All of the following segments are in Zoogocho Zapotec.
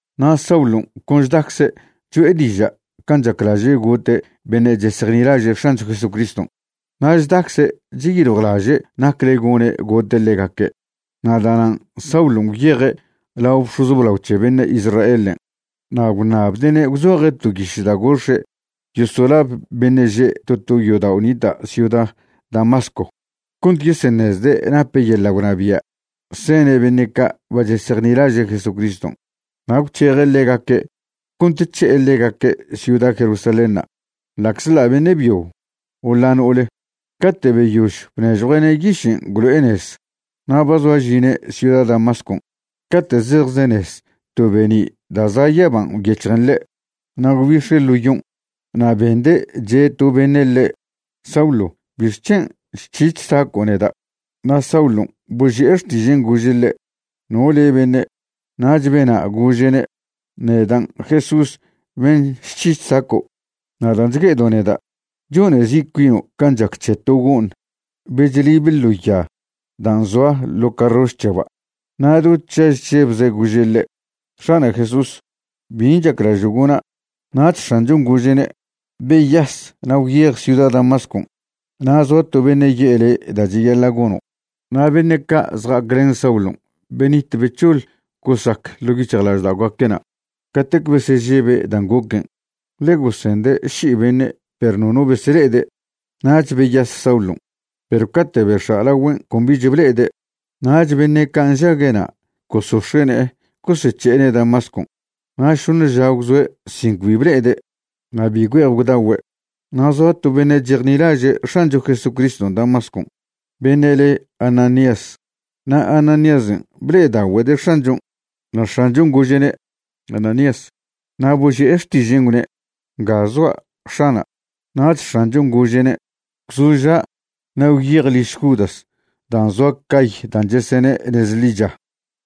Na' Saulon' con chdacze' cho'e diža' can' chaclaže' gote' beṉe' chesejnilaže' X̱ancho Jesucriston' na' chdacze' cheyiljwlaže' nacle gone' gote' ḻegaque'. Na' da'nan' Saulon' gwyeje' lao bx̱oz blao c̱he beṉe' Israelen', na' gwṉabde'ne' gwzoje' to yiš da' gox̱e' yosolab beṉe' že' to to yodao' nita' ciuda Damasco cont yeseṉezde' nape' yeḻa' gwnabia' sene' beṉe' ca' ba chesejnilaže' Jesucriston' na' gwc̱heje' ḻegaque' cont c̱he'e ḻegaque' ciuda Jerusalénṉa' ḻa'czḻa' beṉe' byo o ḻa' no'ole. Cate' beyož bnežjue'ne' yišen' gwlo'e nez, na' ba zoa žine' ciuda Damascon' cate' zejzenez to be'ni' da' za' yaban' gwyec̱hjen ḻe'. Na' gwbix̱e' ḻo yon'. Na' bende' che' to beṉe' ḻe': ―Saulo, ¿bixc̱hen' chc̱hi chsaco' neda'? Na' Saulon' boži'e xtižen' gože' ḻe': ―¿No le' beṉe'? Nach bena' gože'ne': ―Nedan' Jesús ben' chc̱hi chsaco'. Na' dan' chgue'edo' neda', chone zi' cuino' can' chac c̱he to go'ṉ be chlibe ḻo ya dan' zoa ḻo carroš c̱heba'. Na' do chaž chžebze' gože' ḻe': ―X̱ana' Jesús, ¿bin' chaclažo' gona'? Nach X̱anchon' gože'ne': ―Beyas na' gwyej ciuda Damascon' na' zoa to beṉe' ye'e le' da' cheyaḻa' gono'. Na' beṉe' ca' zja'aclen Saulon' benit bec̱hoḻ gosac ḻo' yic̱hjlažda'ogaque'na' catec besežebe' dan' goquen', ḻe gosende' ši'i beṉe' perw nono besele'ede'. Nach beyas Saulon', perw cate' bex̱a' lagüen' con bich ble'ede'. Nach beṉe' ca' nžague'na' gosox̱e' ne'e gosec̱he'ene' Damascon'. Na' šoṉe ža gwzoe' sin cbi ble'ede' na' bi güe'ej gwdagüe'. Na' zoa to beṉe' chejnilaže' X̱ancho Jesucriston' Damascon' beṉe' le Ananías, na' Ananíasen' ble'edagüede' X̱anchon'. Na' X̱anchon' gože'ne': ―Ananías. Na' boži'e xtižen' gwne': ―Nga zoa', X̱ana'. Nach X̱anchon' gože'ne': ―Gwzoža' na' gwyej liž Judas dan' zoa cay dan' chesene' Nez Ḻicha,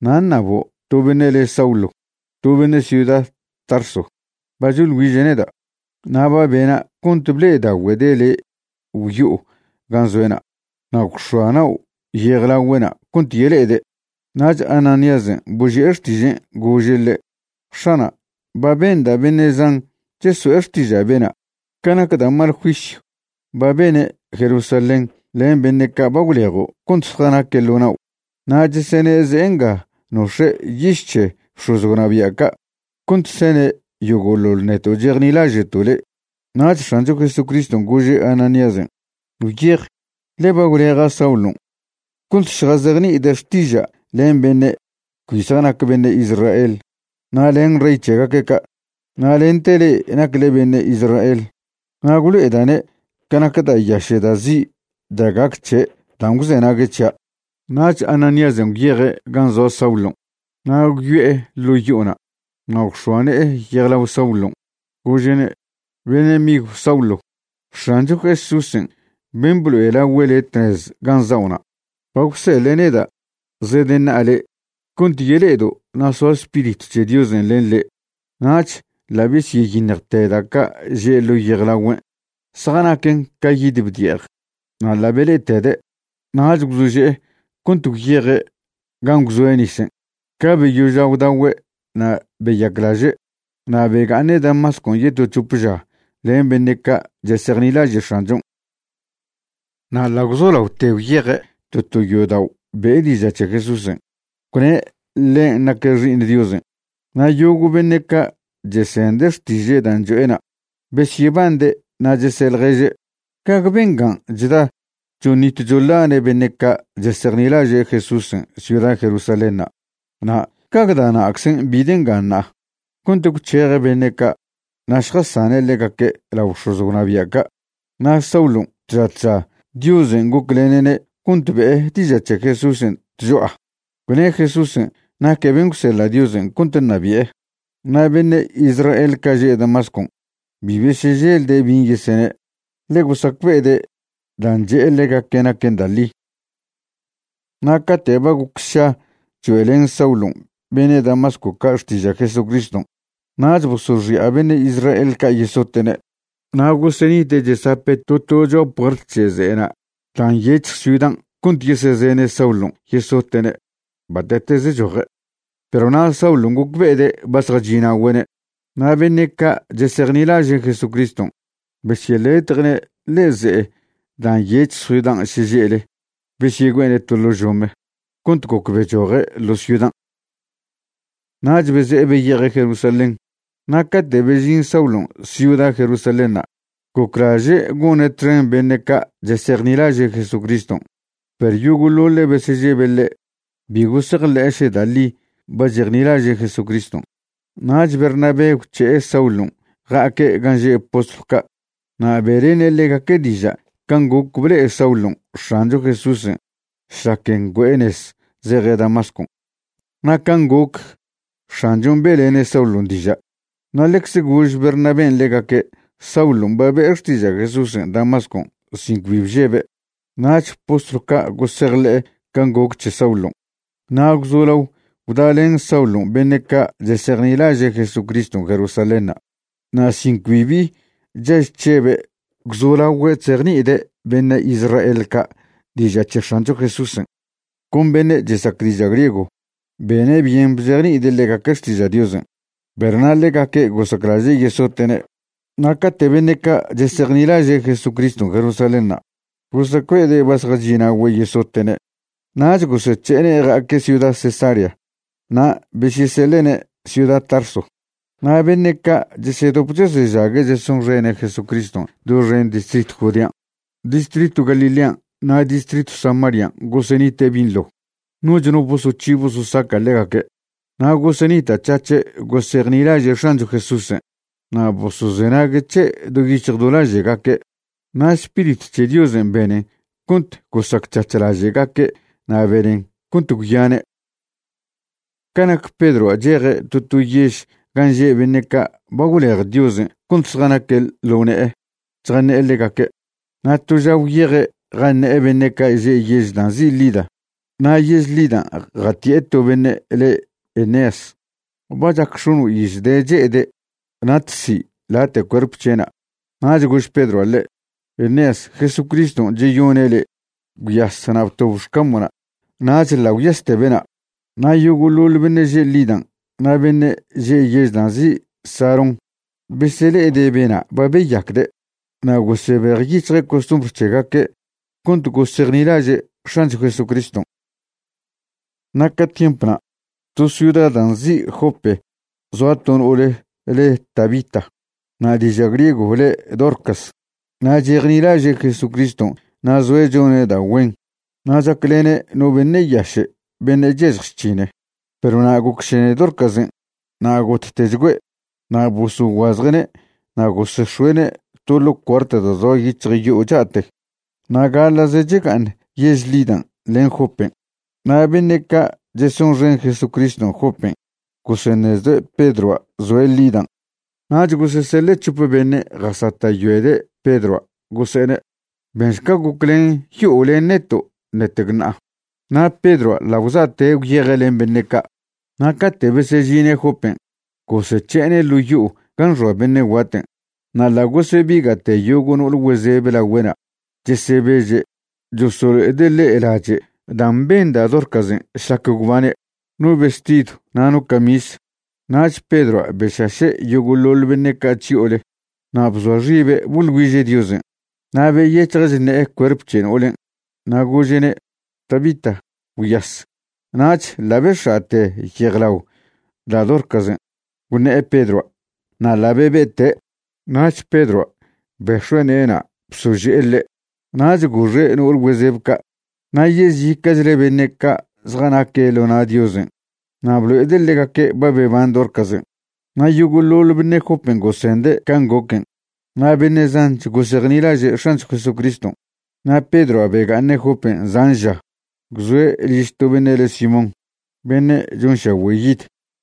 na' ṉabo' to beṉe' le Saulo, to beṉe' ciuda Tarso. Ba choḻ güiže' neda'. Na' ba bena' cont ble'edagüede' le' gwyo'o gan' zoe'na' na' gwx̱oa nao' yejlagüe'na' cont yele'ede'. Nach Anaíasen' boži'e xtižen' gože' ḻe': ―X̱ana', ba benda' beṉe' zan cheso'e xtiža' bena', ca nac da' mal juisyw ba bene' Jerusalén len beṉe' ca' ba gwlejo' cont zjanaque' ḻo nao'. Na' chesene' ze'e nga nox̱e' yiš c̱he bx̱oz gwnabia' ca' cont sene' yogo'ḻoḻ neto' chejnilaže'to' le'. Nach X̱ancho Jesucriston' gože' Ananíasen': ―Gwyej, ḻe ba gwleja' Saulon' cont šjazejni'ide' xtiža' len beṉe' cbi zjanac beṉe' Israel na' len rey c̱hegaque' ca', na' lente le'e nacle beṉe' Israel. Na' gwlo'eda'ne' ca nac da' yaše' da' zi' da' gac c̱he' dan' gwzenague' c̱hia'. Nach Ananíasen' gwyeje' gan' zoa Saulon' na' gwyo'e ḻo' yo'ona' na' gwx̱oa ne'e yejlao Saulon', gože'ne': ―Beṉe' migw Saulo, X̱ancho Jesúsen' ben' blo'elagüe' le' tnez gan' za'ona' ba gwseḻe' neda' zedeṉa'a le' cont yele'edo' na' soa Spiritw c̱he Diosen' len le'. Nach ḻa' besyeyiṉjte da' ca' že' ḻo yejlagüen', zjanaquen ca yid bdi'ej, na' ḻa' bele'etede'. Nach gwzože'e cont gwyeje' gan' gwzoe' nisen'. Ca beyoža' gwdagüe' na' beyaclaže'. Na' bega'aṉe' Damascon' yeto c̱hop ža len beṉe' ca' chesejnilaže' X̱anchon'. Na' ḻa' gwzolaote gwyeje' to to yodao' be'e diža' c̱he Jesúsen', gwne' ḻen' naque' Xi'iṉ Diosen'. Na' yogo' beṉe' ca' chesende' xtiže' dan' cho'ena' besyebande' na' chese' ḻježe': ―¿Gague bengan' chda choṉit choḻane' beṉe' ca' chesejnilaže' Jesúsen' ciuda Jerusalénṉa'? na' ¿gague da' na'czen' bide' nga ṉa'a cont gwc̱heje' beṉe' ca' na' šjasane' ḻegaque' lao bx̱oz gwnabia' ca'? Na' Saulon' tža tža Diosen' goclene'ne' cont be'e diža' c̱he Jesúsen' tcho'a, gwne' Jesúsen' naque' ben' gwseḻa' Diosen' cont ṉabi'e. Na' beṉe' Israel ca' že' Damascon' bi beseželde' bin' yeseṉe', ḻe gosacbe'ede' dan' che'e ḻegaque' naquen da' ḻi. Na' cate' ba goc sša choe'len Saulon' beṉe' Damasco ca' xtiža' Jesucriston' nach bosoxi'a beṉe' Israel ca' yesote'ne'. Na' gosenite' chesape' to to cho'a puert c̱he ze'ena' dan' nyec̱hj ciudan' cont yesezene' Saulon' yesote'ne' bate'teze choje', perw na' Saulon' gocbe'ede' ba zjachi'na'ogüe'ne'. Na' beṉe' ca' chesejnilaže' Jesucriston' besyeletje'ne' ḻe'e ze'e dan' nyec̱hj ciudan' šeže'le besyegüe'ene' to ḻo' žome cont goc bechoje' ḻo ciudan'. Nach beze'e beyeje' Jerusalén. Na' cate' bežin Saulon' ciuda Jerusalénṉa' goclaže' gone' txen beṉe' ca' chesejnilaže' Jesucriston', perw yogo'ḻoḻe' besežebe' ḻe', bi gosejḻe'e še da' ḻi ba chejnilaže' Jesucriston'. Nach Bernabé gwc̱he'e Saulon' ja'aque' gan' že' postlw ca' na' be'lene' ḻegaque' diža' can' goc ble'e Saulon' X̱ancho Jesúsen' šlac ngüe'e nez zeje' Damascon' na' can' goc X̱anchon' be'lene' Saulon' diža'. Na' ḻecze gož Bernabén' ḻegaque' Saulon' ba be'e xtiža' Jesúsen' Damascon' sin cbi bžebe'. Nach postlw ca' gosejḻe'e can' goc c̱he Saulon', na' gwzolao gwdalen Saulon' beṉe' ca' chesejnilaže' Jesucriston' Jerusalénṉa'. Na' sin cbi bi chaž chžebe' gwzolagüe' chzejni'ide' beṉe' Israel ca' diža' c̱he X̱ancho Jesúsen', con beṉe' chesac diža' griego. Bene' byen bzejni'ide' ḻegaque' xtiža' Diosen', perw na' ḻegaque' gosaclaže' yesote'ne'. Na' cate' beṉe' ca' chesejnilaže' Jesucriston' Jerusalénṉa' gosacbe'ede' ba zjachi'na'ogüe' yesote'ne', nach gosec̱he'ene' ja'aque' ciuda Cesarea na' besyeseḻe'ne' ciuda Tarso. Na' beṉe' ca' chesedop chesežague' chesonxene' Jesucriston' doxen distritw Judean', distritw Galilean' na' distritw Samarian' gosenite' binḻo, noch no bosoc̱hi bososaca' ḻegaque', na' gosenita'c̱hac̱he' gosejnilaže' X̱ancho Jesúsen' na' bosozenague' c̱he' do yic̱hj do laže'gaque'. Na' Spiritw c̱he Diosen' benen cont gosacc̱hac̱h laže'gaque' na' benen cont gwyane'. Ca nac Pedroa' cheje' to to yež gan' že' beṉe' ca' ba gwlej Diosen' cont zjanaque' ḻo ne'e chjaṉe'e ḻegaque'. Na' to ža gwyeje' jaṉe'e beṉe' ca' že' yež dan' nzi' Lida. Na' yež Lidan' jati'e to beṉe' le' Eneas. Ba chac x̱ono' iz de' che'ede', natzi' late' cuerp c̱he'na'. Nach gož Pedroa' ḻe': ―Eneas, Jesucriston' cheyone' le'. Gwyas na' btob xcamo'na'. Nach ḻa' gwyaste bena'. Na' yogo'ḻoḻ beṉe' že' Lidan' na' beṉe' že' yež dan' nzi' Sarón besele'ede' bena' ba beyacde' na' gosebejyic̱hje' costumbr c̱hegaque' cont gosejnilaže' X̱ancho Jesucriston'. Na' ca tiemp na', to ciuda dan' nzi' Jope zoa to no'ole le' Tabita, na' diža' griego le' Dorcas. Na' chejnilaže' Jesucriston' na' zoe' chone' da' güen na' chaclene' no beṉe' yaše' beṉe' chyažj chc̱hine'. Perw na' gocšene Dorcasen' na' gottechgüe', na' bosoguazje'ne' na' gosex̱oe'ne' to ḻo' cuart da' zoa yic̱hj yo'o cha'te. Na' gaḻa'ze chega'aṉ yež Lidan' len Jopen', na' beṉe' ca' chesonxen Jesucriston' Jopen' goseṉezde' Pedroa' zoe' Lidan'. Nach goseseḻe' c̱hope beṉe' jasata'yoede' Pedroa' gose'ene': ―Benšca goclen yo'o len neto' ṉetec ṉa'a. Na' Pedroa' ḻa' gwza'te' gwyeje' len beṉe' ca'. Na' cate' besežine' Jopen', gosec̱he'ene' ḻo' yo'o gan' xoa beṉe' guaten', na' ḻa' gosebiga'te yogo' no'ol güezebe lagüe'na' chesebeže' chosolo'ede' ḻe' lache' dan' ben da' Dorcasen' šlac gwbane', no vestidw na' no camis. Nach Pedroa' bešaše' yogo'ḻoḻ beṉe' ca' chyo'ole na' bzoa xibe' boḻ güiže' Diosen'. Na' beyec̱hje' chṉe'e cuerp c̱he no'olen', na' gože'ne': ―Tabita, gwyas. Nach ḻa' bex̱a'te yejlao da' Dorcasen' gwṉe'e Pedroa' na' ḻa' bebe'te'. Nach Pedroa' bex̱ue' ne'ena' bsože'e ḻe', nach goxe' no'ole güezeb ca' na' yezica'chle beṉe' ca' zjanaque' ḻo na' Diosen' na' blo'ede' ḻegaque' ba beban Dorcasen'. Na' yogo'ḻoḻ beṉe' Jopen' gosende' can' goquen', na' beṉe' zanch gosejnilaže' X̱ancho Jesucriston'. Na' Pedroa' bega'aṉe' Jopen' zan ža, gwzoe' liž to beṉe' le Simón, beṉe' chonšagüe' yid.